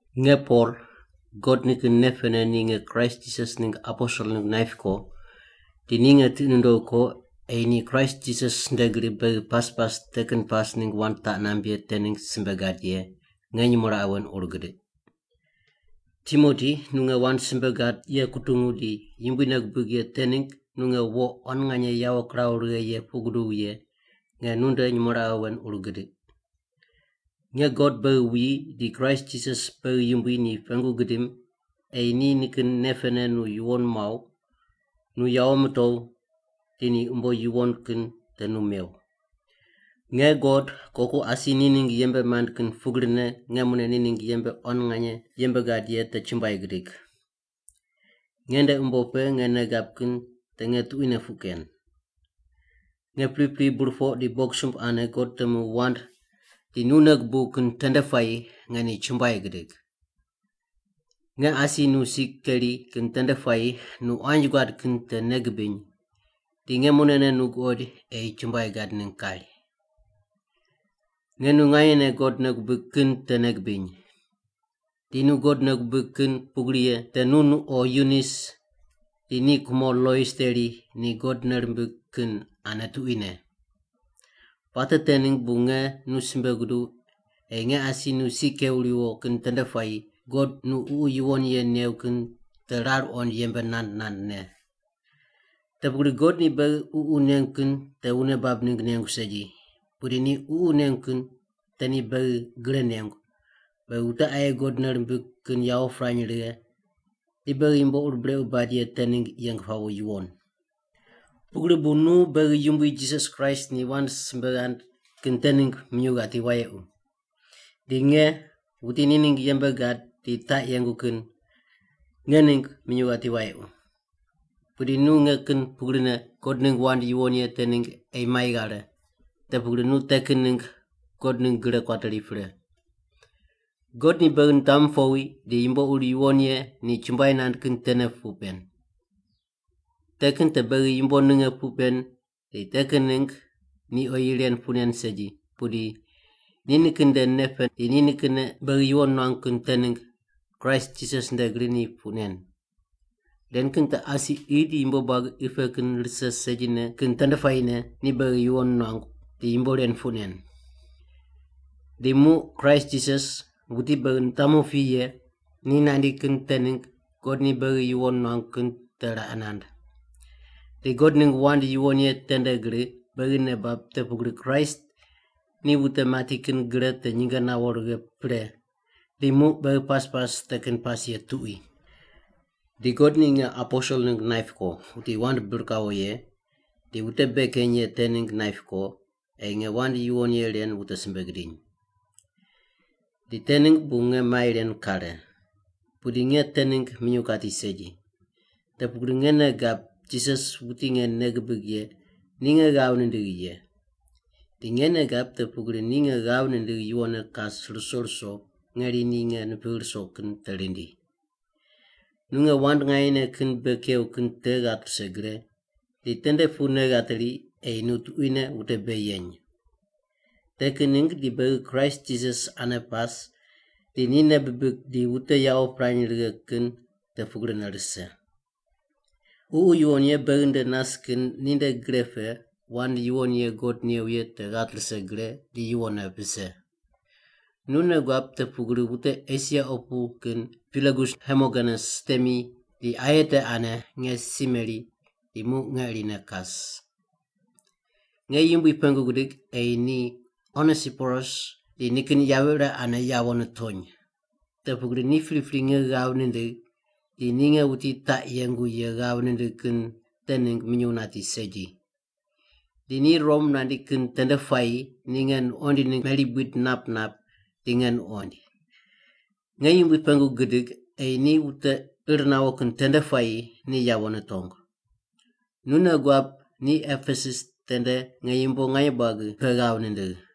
Nge Pol, God nikin nei pene ni nge Kraist Jisas ningg aposel ningg naip ko, di ni nge tiqi nundogh ko ei ni Kraist Jisas nde gri beghi pas pas te kin pas ningg wand taq namb ye te ningg simbe gad ye, nge nyumo raqe wen ur gidiq. Timoti nu nge wand simbe gad ye kutungu di Yumbui nei gubig ye te ningg nu nge wo quan nganye yawo kiraw righe ye puq guduw ye, nge nunde nyumo raqe wen ur gidiq. Nge God beghi wuyi di Kraist Jisas beghi Yumbui ni pengu gidim ei ni nikin nei pene nu yuwon muaw, nu yawo mitow, di ni umbo yuwon kin te nu mew. Nge God koku asi ni ningg yembe mand kin pugrine nge mune ni ningg yembe quan nganye yembe gad ye te chumbuai gidig. Nge nde umbo pe nge nei gab kin te nge tuquine puq ken. Nge pripri burpoq di bogisumb ane God temu wand di nu nei gubuw kin tende puayi nge ni chumbuai gidig. Nge asi nu si keri kin tende puayi nu quanji guad kin te nei gibiny di nge munene nu guqoid ei chumbuai gad ningg kari. Nge nu nganyene God nei gubig kin te nei gibiny. Di nu God nei gubig kin pugri ye te nu numo Yunis di ni kumo Lois teri ni God nei rimbig kin ane tuquine. Puate te ningg bu nge nu simbe guduw ei nge asi nu si kew riwo kin tende puayi God nu Ququ Yuwon Ye new kin te rar qoind yembe nand nandne. Te pugri God ni beghi Ququ nengu kin te wune bab ningg nengu segi, pudi ni Ququ nengu kin te ni beghi gre nengu, beghi wute aye God nei rimbig kin yawo pirany righe di beghi yumbo ur brequ bad ye te ningg yeng pawo yuwon. Pugri bu nu beghi Yumbui Jisas Kraist ni wand simbe ghand kin te ningg minyuw ghati wayequ. Di nge, wuti ni ningg yembe gad di taq yengu kin, nge ningg minyuw ghati wayequ. Pudi nu nge kin pugrine God ningg wand yuwon ye te ningg ei mai ghare, te pugri nu te kin ningg God ningg gre kuateri pre. God ni beghi nitamu powi di yumbo ur yuwon ye ni chumbuai nand kin tene puq pen. Te kin te beghi yumbo ninge puq pen di te kin ningg ni oyi ren puq nen segi, pudi ni nikin nde nei pe di ni nikinne beghi yuwon nuangu kin te ningg Kraist Jisas nde gri ni puq nen. Ren kin te asi qi di yumbo buagi qi pe kin rise segine kin tende puayine ni beghi yuwon nuangu di yumbo ren puq nen. Di muq Kraist Jisas, wuti beghi nitamu pi ye, ni nandi kin te ningg God ni beghi yuwon nuangu kin te raqe nand. Di God ningg wand yuwon ye te nde gri beghi nei bab te pugri Kraist ni wute mati kin gre te nyinge nawo righe pre, di muq beghi pas pas te kin pas ye tuqui. Di God ni nge aposel ningg naip ko, wuti wand bir kawo ye di wute bei keny ye te ningg naip ko ei nge wand yuwon ye ren wute simbe gidiny. Di te ningg bu nge mai ren kare. Pudi nge te ningg minyuw kati segi. Te pugri nge nei gab Jisas wuti nge nei gibig ye ni nge ghav nindigh ye. Di nge nei gab te pugri ni nge ghav nindigh yuwonne kas ruso ruso ngeri ni nge nipigh ruso kin te rindi. Nu nge wand nganyene kin bei kew kin te ghat rise gre di tende pu nei ghateri ei nu tuquine wute bei yeny. Te kin ningg di beghi Kraist Jisas ane pas di ni nei bibig di wute yawo pirany righe kin te pugrine rise. Ququ Yuwon Ye beghi nde nas kin ninde gre pe wand yuwon ye God new ye te ghat rise gre di yuwonne vise. Nu nei guab te pugri wute Esia opu kin Pigelus Hermogenes temi di aye te ane nge si meri di muq nge irine kas. Nge Yumbui pengu gidig ei ni Onesiporus di nikin yavi ire ane yawo nitony, te pugri ni pripri nge ghav nindigh di ni nge wuti taq yengu ye ghav nindigh kin te ningg minyuw nati segi. Di ni Rom nandi kin tende puayi ni nge nuqoind ningg meri buid nap nap di nge nuqoind. Nge Yumbui pengu gidig ei ni wute ir nawo kin tende puayi ni yawo nitong. Nu nei guab ni Epesus tende nge yumbo nganye buagi pe ghav nindigh.